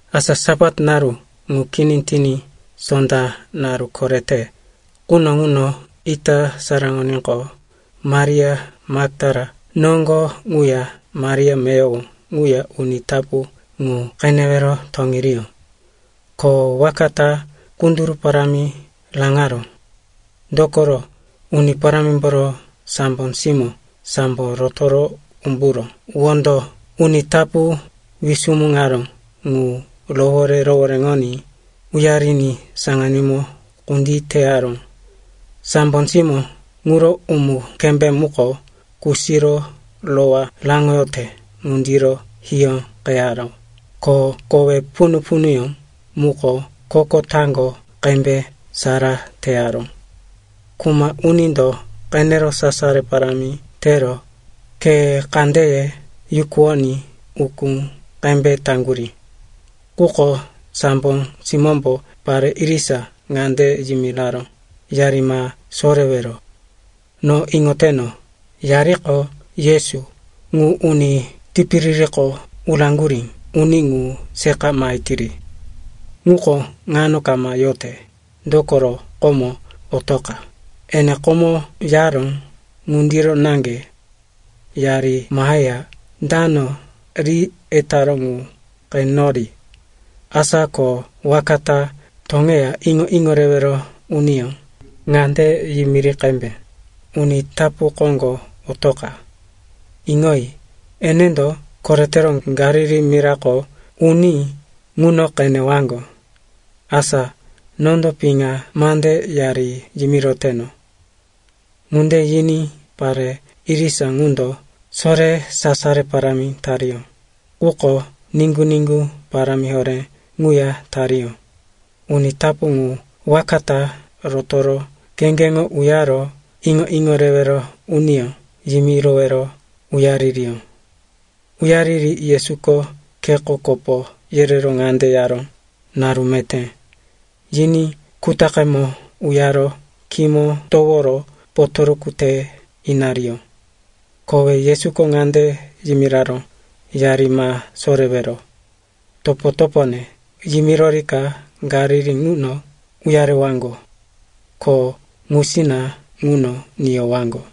Asa Sapat naru ŋu kini tiní, sonda naru korete quno ŋuno, ita saraŋoníqo, Maria Maktala noŋgo ŋuya Maria meyowo ŋuya uni tapu ŋu qenewero toŋeriyó. Ko waka ta kunduru parámi raŋaró. Dokoro Uni Parámimboro sambo simó sambo rotoro umburo wondo uni tapu wisumuŋaró ŋu rohoré-rohoréŋoní uyariní saŋanímo kunditeyaró. Sambo simó ŋuro umu-kembé muko kusiro rowá raŋoyote ŋundiro hiyóqeyaró, ko kowe punu-punuyó muko koko taŋgo qembe sara teyaró. Kuma unindo qenero sasaro parámi tero khe kandeye yukuwoní ukú qembe taŋgurí. Quko sambo simómbo pare irisa ŋande yimiraró, “Yari ma sorewero. No iŋoteno, yariko Yesu, ŋu uni tipiririko uraŋgurí uni ŋu seqa mahetiri. Ŋuko ŋano kama yote, dokoro komo otoqa, ene komo yaró ŋundiro naŋge. Yari maheya dano ri etaró ŋu qenori. Asa ko waka ta toŋeya iŋo-iŋo rewero uniyó ŋande yimiri qembe, ‘Uni tapu koŋgo otoqa. Iŋoyi, enendo koretero Galili mirako uní ŋuno qenewaŋgo.’ Asa nondo piŋa mande yari yimiroteno.” Ŋunde yiní pare irisa ŋundo sore sasaro parámi tariyó, quko niŋgu-niŋgu parámi horé ŋuya tariyó. Uni tapu ŋu waka ta rotoro kheŋgeŋo uyaro iŋo-iŋo rewero uniyó yimirowero uyaririyó. Uyariri Yesuko kheko kopo yerero ŋande yaró, “Naru meté.” Yiní kutaqemo uyaro khímo toworo potoruku te inariyó. Kowe Yesuko ŋande yimiraró, “Yari ma sorewero. Topo-topone yimirorika Galili ŋuno uyarewaŋgo. Ko ŋusina ŋuno niyowaŋgo.”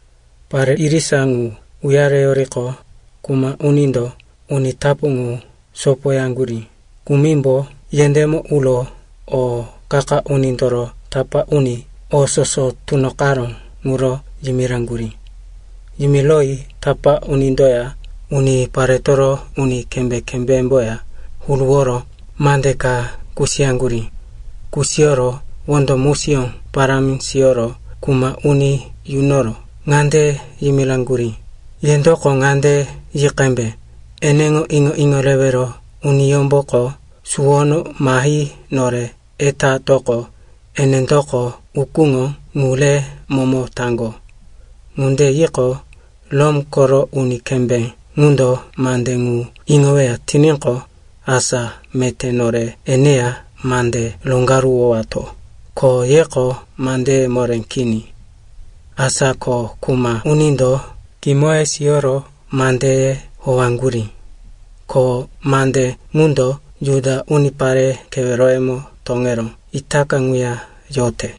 Pare irisa ŋu uyareyoriqo, kuma unindo uni tapu ŋu sopoyaŋgurí kumimbo yendémo uro o qa-qa unindoro tapá uni o soso tunoqaró ŋuro yimiraŋgurí. Yimiroyi tapá unindoya uniparetoro uni kembé-kembémboya huruworo mande ka kusiyaŋgurí. Kusiyoro wondo musiyó parámi siyoro kuma uni yunoro ŋande yimiraŋgurí, “Yendoko ŋande yi qembe, ‘Eneŋo iŋo-iŋo rewero uniyómboko suwono mahi nore etatoqo, enendoko ukúŋo ŋu re momo taŋgo.’ Ŋunde yiqo, Rom koro uni kembé ŋundo mande ŋu iŋoweya tiníqo, asa meté nore eneya mande roŋgaruwowato, ko yeko mandeye moré kini.” Asa ko kuma unindo kimoye siyoro mandeye howaŋgurí. Ko mande ŋundo Juda unipare keweroyemo toŋero itaka ŋuya yote.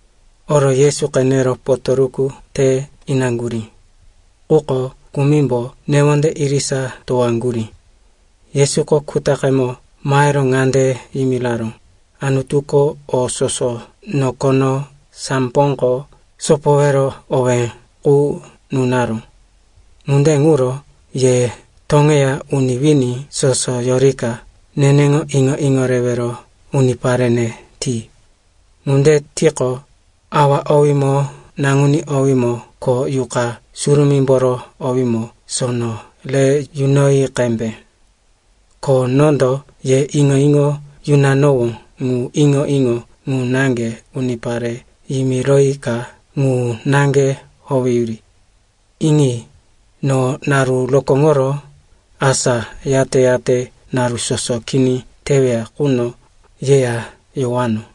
Oro Yesu qenero potoruku te inaŋgurí. Quko kumimbo newonde irisa towaŋgurí. Yesuko kutaqemo mahero ŋande yimiraró, “Anutuko o soso nokono, samboko sopowero owé qu nunaró. Ŋunde ŋuro ye toŋeya uni wini soso yorika neneŋo iŋo-iŋo rewero uniparene ti. Ŋunde tiqo, Awa owímo, Naŋuní owímo ko Yuqa Surumímboro owímo sono re yunoyi qembe. Ko nondo ye iŋo-iŋo yunanowó ŋu iŋo-iŋo ŋu naŋge unipare yimiroyika ŋu naŋge howeyuri. Iŋi, no naru rokóŋoro, asa yate-yate naru soso kini teweya quno yeya yowano.”